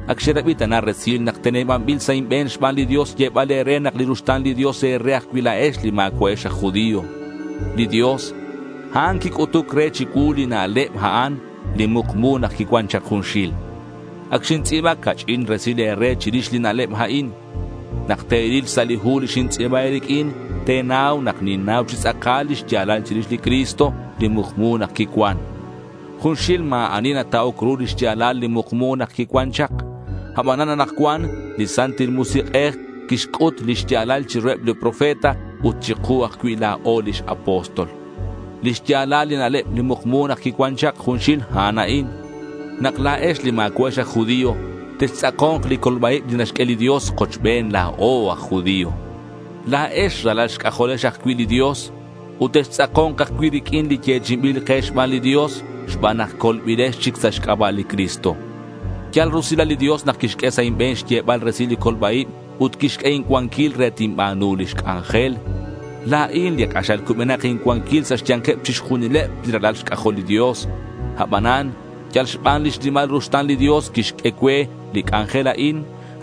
Ac xerabi ta na resil nak tenebanbil sa' inbe̱n xban li Dios xyebal e̱re nak li ruxta̱n li Dios e̱re ajcui' la̱ex li ma̱cua'ex aj judío. Li Dios, a'an quic'utuc re chicuu li na'leb a'an, li mukmu nak quicuan chak junxil. Ac xintz'i̱ba ca'ch'in resil e̱re chirix li na'leb a'in. Nak te̱ril xsa' li hu li xintz'i̱ba e̱riq'uin, te̱nau nak ninnau chi tz'akal li xya̱lal chirix li Cristo, li mukmu nak quicuan. Junxil ma̱ ani nata'oc ru lix ya̱lal li mukmu nak quicuan chak. Abanan anakcuan li Santil Musik'ej quixc'ut li xya̱lal chiruheb li profeta ut chiku ajcui' la̱o lix apóstol. Li xya̱lal li na'leb li mukmu nak quicuan chak junxil, a'an a'in: nak la̱ex li ma̱cua'ex aj judío, textz'ako̱nk li colba-ib li naxq'ue li Dios kochben la̱o aj judío. La̱ex ralal xc'ajolex ajcui' li Dios ut textz'ako̱nk ajcui' riq'uin li yechi'inbil ke xban li Dios xban nak colbilex chic sa' xc'aba' li Cristo. Yal rusilal li Dios nak quixq'ue sa' inbe̱n xyebal resil li colba-ib ut quixq'ue incuanquil re tinba̱nu lix c'anjel. La̱in li k'axal cubenak incuanquil sa' xya̱nkeb chixjunileb li ralal xc'ajol li Dios. Abanan yal xban lix nimal ruxta̱n li Dios quixq'ue cue li c'anjel a'in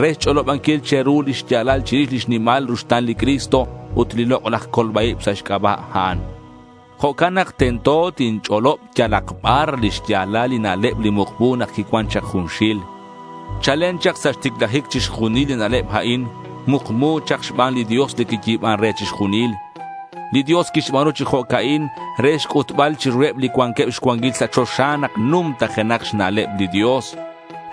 re xch'olobanquil che̱ru lix ya̱lal chirix lix nimal ruxta̱n li Cristo ut li lok'laj colba-ib sa' xc'aba' a'an. Jo'can nak tento tinch'olob yalak bar li xya̱lal li na'leb li mukmu nak quicuan chak junxil. Chalen chak sa' xticlajic chixjunil li na'leb a'in mukmu chak xban li Dios li quiyi̱ban re chixjunil. Li Dios quixba̱nu chi jo'ca'in re xc'utbal chiruheb li cuanqueb xcuanquil sa' choxa nak numtajenak xna'leb li Dios.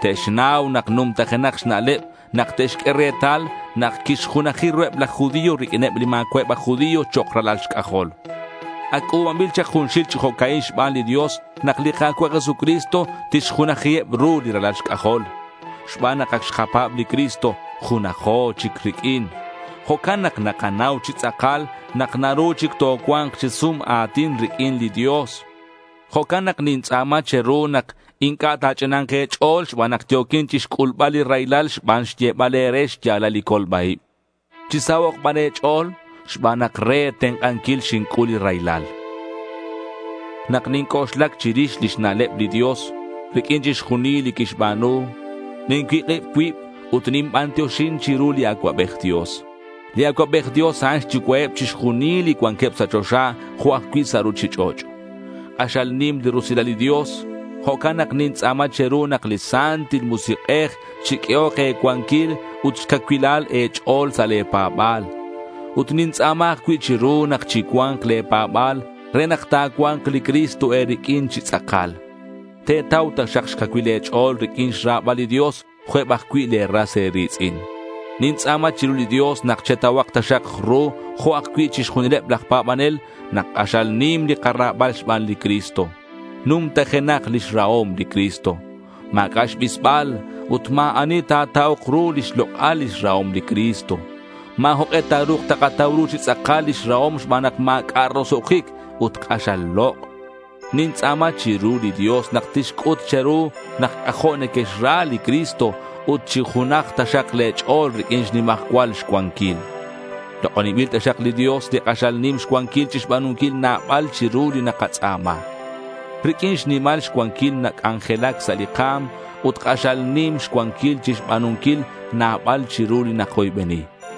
Te'xnau nak numtajenak xna'leb nak te'xq'ue retal nak quixjunaji ruheb laj judío riq'uineb li ma̱cua'eb aj judío chok' ralal xc'ajol. Ac c'u̱banbil chak junxil chi jo'ca'in xban li Dios nak li Ka̱cua' Jesucristo tixjunajiheb ru li ralal xc'ajol. Xban nak ac xkapa̱b li Cristo, junajo chic riq'uin. Jo'can nak nakanau chi tz'akal nak naru chic tocua̱nk chi sum a̱tin riq'uin li Dios. Jo'can nak nintz'a̱ma che̱ru nak inc'a' ta̱ch'ina̱nk e̱ch'o̱l xban nak yo̱quin chixc'ulbal li raylal xban xyebal e̱re xya̱lal li colba-ib. Chisahok' ban e̱ch'o̱l xban nak re e̱tenk'anquil xinc'ul li raylal. Nak ninc'oxlac chirix lix na'leb li Dios riq'uin chixjunil li quixba̱nu, nincuik'ib cuib ut ninbantioxin chiru li Acuabej Dios. Li Acuabej Dios a'an xyucua'eb chixjunil li cuanqueb sa' choxa, jo' ajcui' sa' ruchich'och'. K'axal nim li rusilal li Dios. Jo'can nak nintz'a̱ma chiru nak li Santil Musik'ej chiq'uehok e̱cuanquilal ut xcacuilal e̱ch'o̱l sa' le̱ pa̱ba̱l. Ut nintz'a̱ma ajcui' chiru nak chicua̱nk le̱ pa̱ba̱l re nak cua̱nk li Cristo e̱riq'uin chi tz'akal. Te̱tau taxak xcacuil le̱ ch'o̱l riq'uin xra̱bal li Dios jo' eb ajcui' le̱ ras e̱ri̱tz'in. Nintz'a̱ma chiru li Dios nak chetauhak taxak ru, jo' ajcui' chixjunileb laj pa̱banel, nak k'axal nim li kara̱bal xban li Cristo. Numtajenak lix rahom li Cristo. Ma̱c'a' xbisbal ut ma̱ ani ta̱ta'ok ru lix lok'al lix rahom li Cristo. Ma̱ jok'e ta̱ru̱k takatau ru chi tz'akal lix rahom xban nak ma̱c'a' roso'jic ut k'axal lok'. Nintz'a̱ma chiru li Dios nak tixc'ut che̱ru nak c'ajo' nequexra li Cristo, ut chinujak taxak le̱ ch'o̱l riq'uin xnimajcual xcuanquil. Lok'oninbil taxak li Dios li k'axal nim xcuanquil chixba̱nunquil nabal chiru li nakatz'a̱ma. Riq'uin xnimal xcuanquil nac'anjelac sa' li ka̱m ut k'axal nim xcuanquil chixba̱nunquil nabal chiru li nakoybeni.